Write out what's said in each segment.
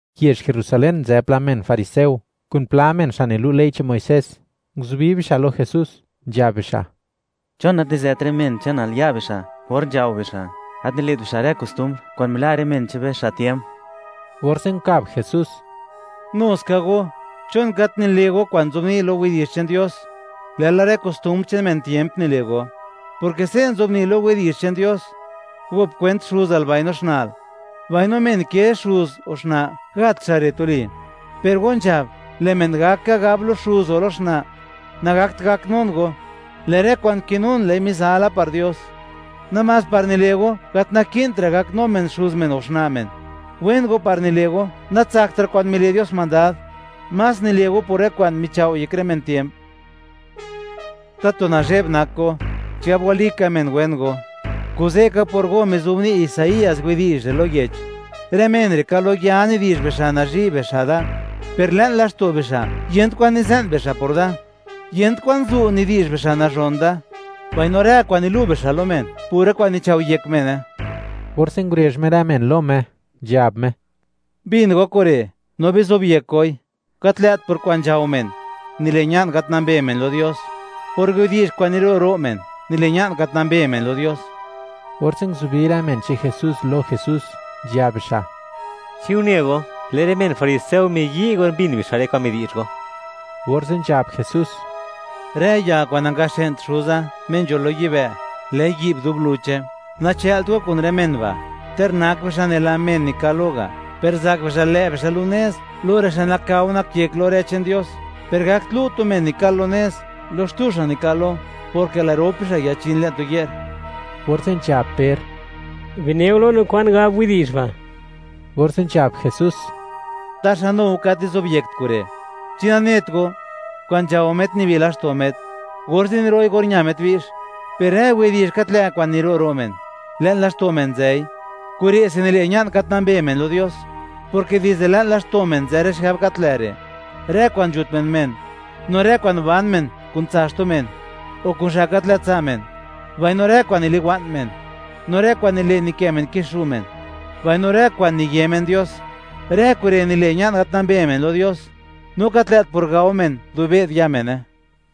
Yezh Jerusalén nzë pla men fariseo, kun pla men, xa' nilu' ley che'n Muisés; nguzubi bixa' lo Jesús, nzhab bixa': ―¿Chon gat nizet rë men che'nal ya' bixa' or nzhao bixa'; gat nile't bixa' rë kostumbr kwa'n mila' rë men che'n be, xa' tiemp? Orze' nkab Jesús: ―Nu ska go, ¿chon gat nile' go kwa'n nzobni' lo Yech che'n Dios, lë'la rë kostumbr che'n men tiemp nile' go?, porke se' nzobni' lo Yech che'n Dios: “Gop kwent xuzal mbaino xna'l”, mbaino: “Men ke xuz o xna', gat xa' re' tuli.” Per go nzhab: “Lë' men gak ka gab lo xuz o lo xna': Nagakt gaknun go; lë' rë kwa'n kinun, lë'i mizala par Dios”, namás par nile' go, gat naki'ntra' gaknu men xuz men o xna' men. Wen go par nile' go, natsaktra' kwa'n mile' Dios mandad. Más nile' go por rë kwa'n michao'yek rë men tiemp. ¡Tatu nazheb nak go, chigab walika men wen go! Kuze' ka, por go mizobni' Isaías widi'zh re' lo yech: Rë men re'; ka lo ya nidi'zh bixa', nazhi' xa' da, per le'n laxto' bixa', yent kwan nize'n bixa' por Da. Yent kwan zu' nidi'zh bixa' nazhon Da, mbaino rë kwa'n nilu' bixa' lo men, pura kwa'n nichao'yek mene. Orze' ngurezh Me rë men lo Me, nzhab Me: ―Bin go kure' no bizobyek goi: Gat lë't por kwa'n nzhao men nile' ña'n gat nambe men lo Dios; por widi'zh kwa'n niro' ro' men, nile' ña'n gat nambe men lo Dios. Orze' nguzubi rë men che'n Jesús lo Jesús, nzhab bixa': ―¿Chi une go, lë' rë men fariseo miyi' or mbin bixa' rë kwa'n midi'zh go? Orze' nzhab Jesús: ―Rë ya kwa'n nangaxë'nt Xuza, Me nzho lo yibë', lë'i yi'b dub luche. Nachë'lt go kun rë men ba'. Ter nak bixa' nela men nikal lo ga', per zak bixa' lë' bixa' lu' nez lo rë xa' nakao nak yek lo rë che'n Dios, per gakt lu' tu men nikal lo nez lo xtu xa' nikal lo, porke lë' rop bixa' yachin le'n tu ye'r. Orze' nzhab Per: ―Bineo lo no kwan gab widi'zh ba'. Orze' nzhab Jesús: ―¿Taxa nu go, gat nizobyekt kure'? ¿Chi nanet go, kwa'n nzhao met nibi laxto' met, orze' niro'i or ña met bi'x? Per rë widi'zh gat lë' kwa'n niro' ro' men, le'n laxto' men nzëi; kure'se nile' ña'n gat nambe men lo Dios, porke dizde le'n laxto' men nzë rë xigab gat lë' re': Rë kwa'n nzhut men men; no rë kwa'n ban men kun tsa' xtu men o kun xa' gat lë' tsa' men; mbaino rë kwa'n niliwa'n men; no rë kwa'n nile' nikë' men kixu' men; mbaino rë kwa'n niye men Dios. Rë kure' nile', ña'n gat nambe men lo Dios, no gat lë't por gao men dub be'd ya' mene.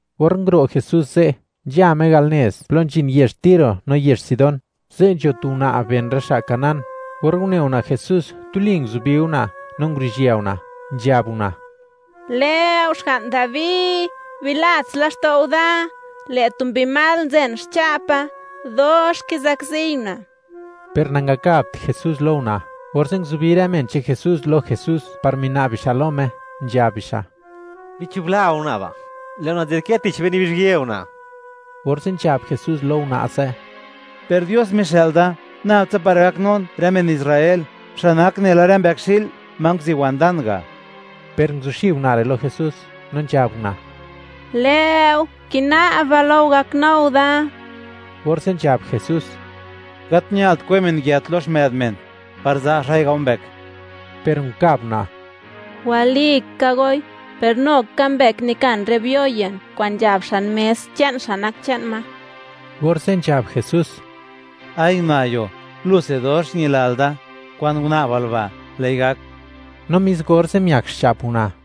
Or nguro' Jesús ze', nzha Me al nez plo nzhin yezh Tiro no yezh Sidón. Ze' nzho tu una' ben rë xa' cananea; or une una' Jesús, tuli nguzubi una' no nguruzhië una', nzhab una': ―¡Lë'o Xga'n Dabi, bilats laxto'u da! ¡Lë' tu mbi mal nzen xcha'pa, dox kizakziy una'! Per nangakabt Jesús lo una', orze' nguzubi rë men che'n Jesús lo Jesús par mina'b bixa' lo Me, nzhab bixa': ―Bichubla go una' ba', lë' una' nzadkë tich be, nibizhyë una'. Orze' nzhab Jesús lo una' ze': ―Per Dios mixë'l da nab tsa par gaknun rë men Israel, xa' nak nela rë mbëkxi'l ma nguziwan dan ga'. Per nguzuxib una' re' lo Jesús, no nzhab una': ―¡Lë'o, kina'ba lo go, gaknu go da! Orze' nzhab Jesús: ―Gat ñalt kwe men yët lo xmë'd men, par za' xa'i gao mbëk. Per nkab una': ―Walika goi; per nu ka mbëk nikan rë biyo ye'n kwa'n nzhab xan mes, che'n xa' nak che'n ma. Orze' nzhab Jesús: ―¡Ay una'yo, luse dox ñilal da! Kwa'n una'bal ba', lë'i gak. No mis orze', miak xcha'p una'.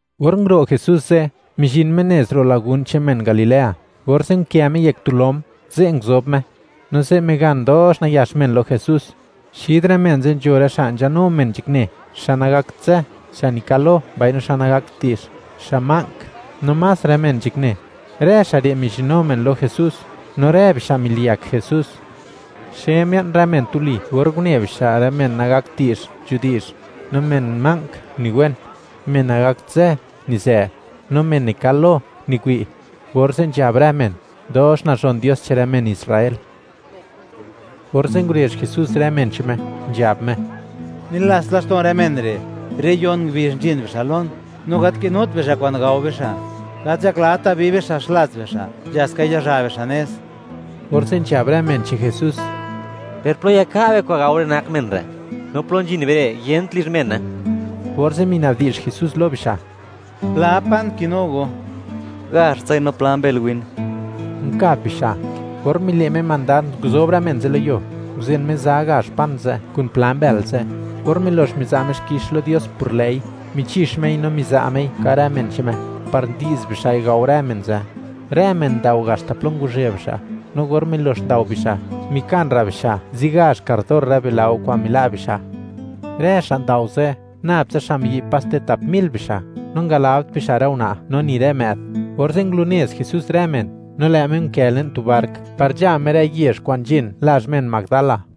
Or nguro' Jesús ze', mizhin Me nez ro' lagún che'n men Galilea, orze' nkë Me yek tu lom, ze' nguzob Me. No ze' migan dox nayax men lo Jesús. Xid rë men ze' nzho rë xa' nzhanu men nzhakne, xa' nagakt zë, xa' nikal lo, mbaino xa' nagakt di'zh, xa' ma'nk, no más rë men nzhakne; rë xa' re' mizhinu men lo Jesús, no rë bixa' miliyak Jesús. Xe mia'n rë men tuli or une bixa' men nagakt di'zh, nzhudi'zh; no men ma'nk uniwen; men nagakt zë, nizë; no men nikal lo, miwi'. Orze' nzhab rë men, dox nazhon Dios che'n rë men Israel. Orze' ngurezh Jesús rë men che'n Me, nzhab Me: ―Nilats laxto'n rë men re', re' yon ngubizh nzhin bixa' lon, no gat kinut bixa' kwa'n gao bixa'. Gat nzhaklata bi bixa' xlats bixa', nzha ska yazha bixa' nez. Orze' nzhab rë men che'n Jesús: ―¿Per plo yaka' be kwa'n gao rë nak men re'? No plo nzhin be re', yent lizh mene. Orze' mina'bdi'zh Jesús lo bixa': ―¿Pla pan kinu go? ―Gazhtsai, no pla mbël win ―nkab bixa'. Or mile' Me mandad, nguzob rë men ze' lo yuo, nguzen Me za gazh pan ze' kun pla mbël ze'. Or milox miza' Me xkix lo Dios por lë'i, michix Mei no miza' Mei, ka' rë men che'n Me, par ndi'z bixa'i gao rë men ze'. Rë men ndao haxta plo ngwazhë bixa', no or milox ndao bixa', mikan ra' bixa' zigazh kardor rë bilao kwa'n mila' bixa'. Rë xa' ndao ze', nab tsa xa' miyi', paste tap mil bixa', no ngalabt bixa' rë una' no ni rë më'd. Orze' ngulunez Jesús rë men, no lë' Me nkë le'n tu bark par nzha Me rë yezh kwa'n nzhin lazh men Magdala.